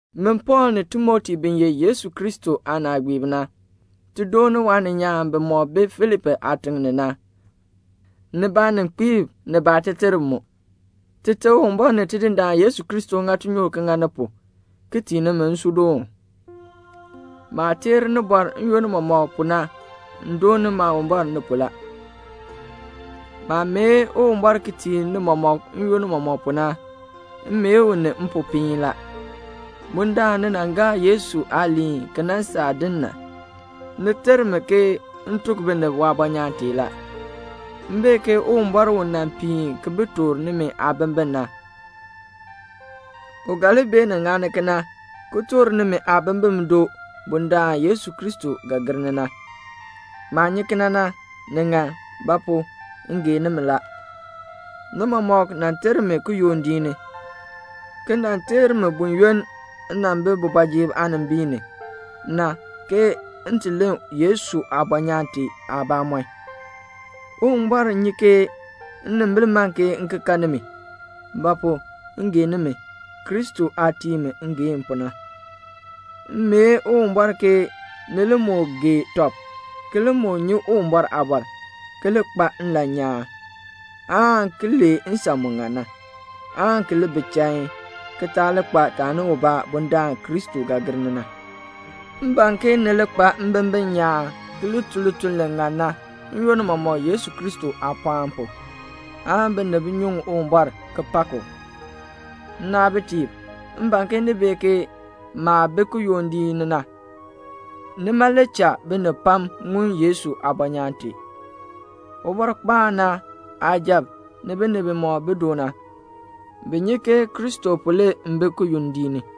Min Pɔɔl ni Timoti bi ye Yesu Kristo aanaagbiib na, ti dooni waaninyaan bimɔk bi Filipi aatiŋ ni na, ni baaninkpiib ni baateterb. Tite Uwumbɔr ni Tidindaan Yesu Kristo ŋa tinyoor ki ŋa ni pu, ki tii nimi nsuudoon. Maah teer nimi n-yoonn mɔmɔk pu na m dooni Maawumbɔr ni pu la. Maah mee Uwumbɔr ki tii ni mɔmɔk n-yoonn mɔmɔk pu na, m mee u ni mpopiin la. Bundaln ni nan gaa Yesu aaliin ki nan saa din na, ni ter mi ke m tuk binib waabɔnyaan tee la. M bee ke Uwumbɔr u nan piin ki bi toor nimi aabimbin na, u ga li beenin ŋani kena ki toor nimi aabimbin doo bundaln Yesu Kristo ga gir ni na. Maah nyi kena na, ni ŋan; ba pu? m gee nimi la. Ni mɔmɔk nan ter mi kiyondiik ni, ki nan ter mi buyoonn m nan bi kooti ni, m ti len Yesu aabɔnyaan tee aabamɔn na. Uwumbɔr nyi ke nnimbil man m ki kan nimi; ba pu? m gee nimi, Kristo aah tii mi ngeehn pu na. M mee Uwumbɔr ke ni li moo gee tɔb ki li moo nyi Uwumbɔr aabɔr, ki li kpa nlan nyaan, aan ki lee nsan mu ŋan na, aan ki li bi chain, ki taa li kpa taani ubaa bundaln Kristo ga gir ni na. M ban ke ni li kpa mbimbin nyaan ki li tun lituln li ŋan na n-yoonn mɔmɔk Yesu Kristo aapɔɔn pu, aan binib nyuŋ Uwumbɔr ki pak u. Nnaabitiib, m ban ke ni bee ke maah bi kiyondiik ni na, nima le cha binib pam ŋun Yesu aabɔnyaan tee. Ubɔrkpaan na aasujatiib ni binib bimɔk bi du na, bi nyi ke Kristo pu le m bi kiyondiik ni.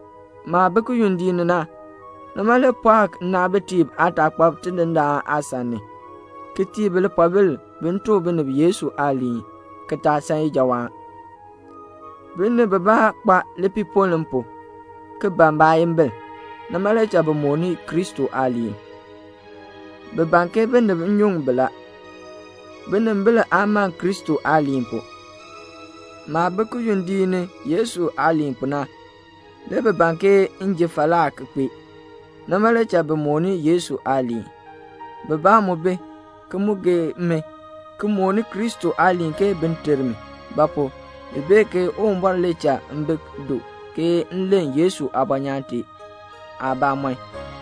Maah bi kiyondiik ni na, nima le pɔɔ nnaabitiib aataakpab Tidindaan aasan ni, ki tii bi lipoobil bin tuk binib Yesu aaliin, ki taa san ijawaan. Binib bibaa kpa lipiipoln m pu, ki ban baayimbil. Nima le cha bi mooni Kristo aaliin. Bi ban ke binib nyuŋ bi la. Binimbil aa man Kristo aaliin pu. Maah bi kiyondiik ni Yesu aaliin pu na, le bi ban ke m ji falaa ki kpee. Nima le cha bi mooni Yesu aaliin. Bibaa mu bi, ki mu gee mi ki mooni Kristo aaliin ke bin ter mi; ba pu? bi bee ke Uwumbɔr le cha m bi du ke m len Yesu aabɔnyaan tee aabamɔn.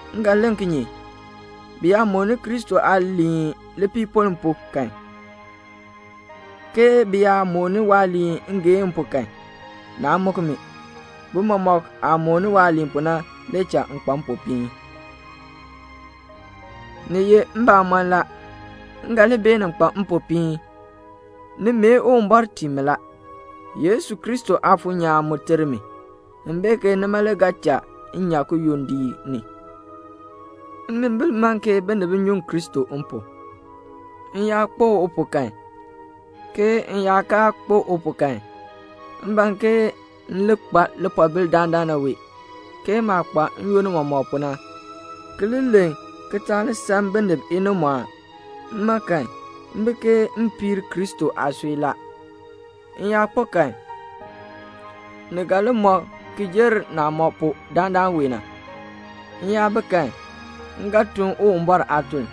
M ga len kinye? Bi yaa mooni Kristo aaliin lipiipoln pu kan, ke bi yaa mooni waaliin ngeehn pu kan, naa muk mi. Bi mɔmɔk aah mooni waaliin pu na le cha m kpa mpopiin. Ni ye mbamɔn la, m ga li beenin kpa mpopiin. Ni mee Uwumbɔr tii mi la. Yesu Kristo Aafuur nyaan mu ter mi. M bee ke nima le ga cha m nyan kiyondiik ni. Nnimbil man ke binib nyuŋ Kristo m pu. M yaa kpo u pu kan, ke m yaa kaa kpo u pu kan, m ban ke m li kpa lipoobil dandana wee, ke maah kpa n-yoonn mɔmɔk pu na, ki li len ki taa li san binib inimɔɔn. Mma kan, m bi ke m piir Kristo aasui la. M yaa kpo kan, ni ga li mɔ ki jer naah mɔ pu dandana wee na. M yaa bi kan, m ga tun Uwumbɔr aatuln.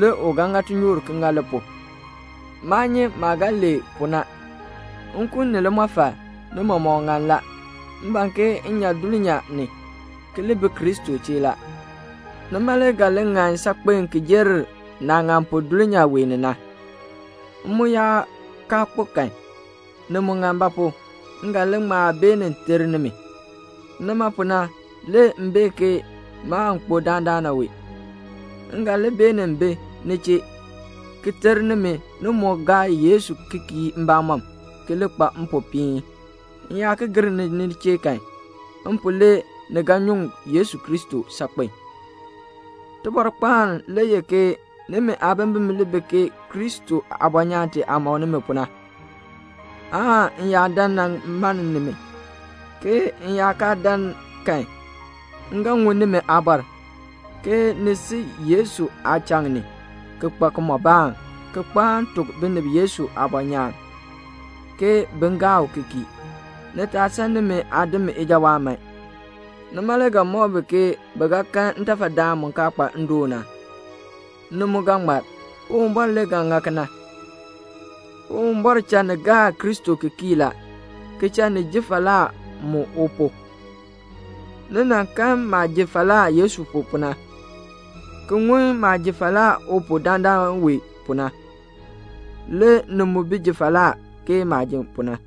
Le u ga ŋa tinyoor ki ŋa li pu. Maa nyi maah ga lee pu na. Nkun ni limɔfal, ni mɔmɔk ŋan la. M ban ke m nyan dulnyaa ni, ki li bi Kristo chee la. Nima le ga li ŋan saakpen ki jer naah ŋan pu dulnyaa wee ni na. M mu yaa kaa kpo kan, ni mu ŋan; ba pu? m ga li ŋma beenin ter nimi. Nima pu na le m bee ke maan kpo dandana wee. M ga li beenin bi ni chee, ki ter nimi ni moo gaa Yesu ki kii mbamɔm, ki li kpa mpopiin. M yaa ki gir ni ni chee kan, m pu le ni ga nyuŋ Yesu Kristo saakpen. Tibɔrkpaan le ye ke nimi aabimbin li bi Kristo aabɔnyaan tee aah mɔk nimi pu na, aan m yaa dan nan mann nimi, ke m yaa kaa dan kan, m ga ŋun nimi aabɔr, ke ni si Yesu aachaŋ ni, ki kpa kimɔbaan, ki kpaan tuk binib Yesu aabɔnyaan, ke bin gaa u ki kii. Ni taa san nimi aadim ijawaan man. Nima le ga mɔk bi ke bi ga kan ntafadaan mu kaa kpa ndoon na. Ni mu ga ŋmar. Uwumbɔr le ga ŋa kena. Uwumbɔr cha ni gaa Kristo ki kii la, ki cha ni ji falaa mu u pu. Ni nan kan maah ji falaa Yesu pu na, ki ŋun maah ji falaa u pu dandana wee pu na. Le ni mu bi ji falaa ke maah ji pu na.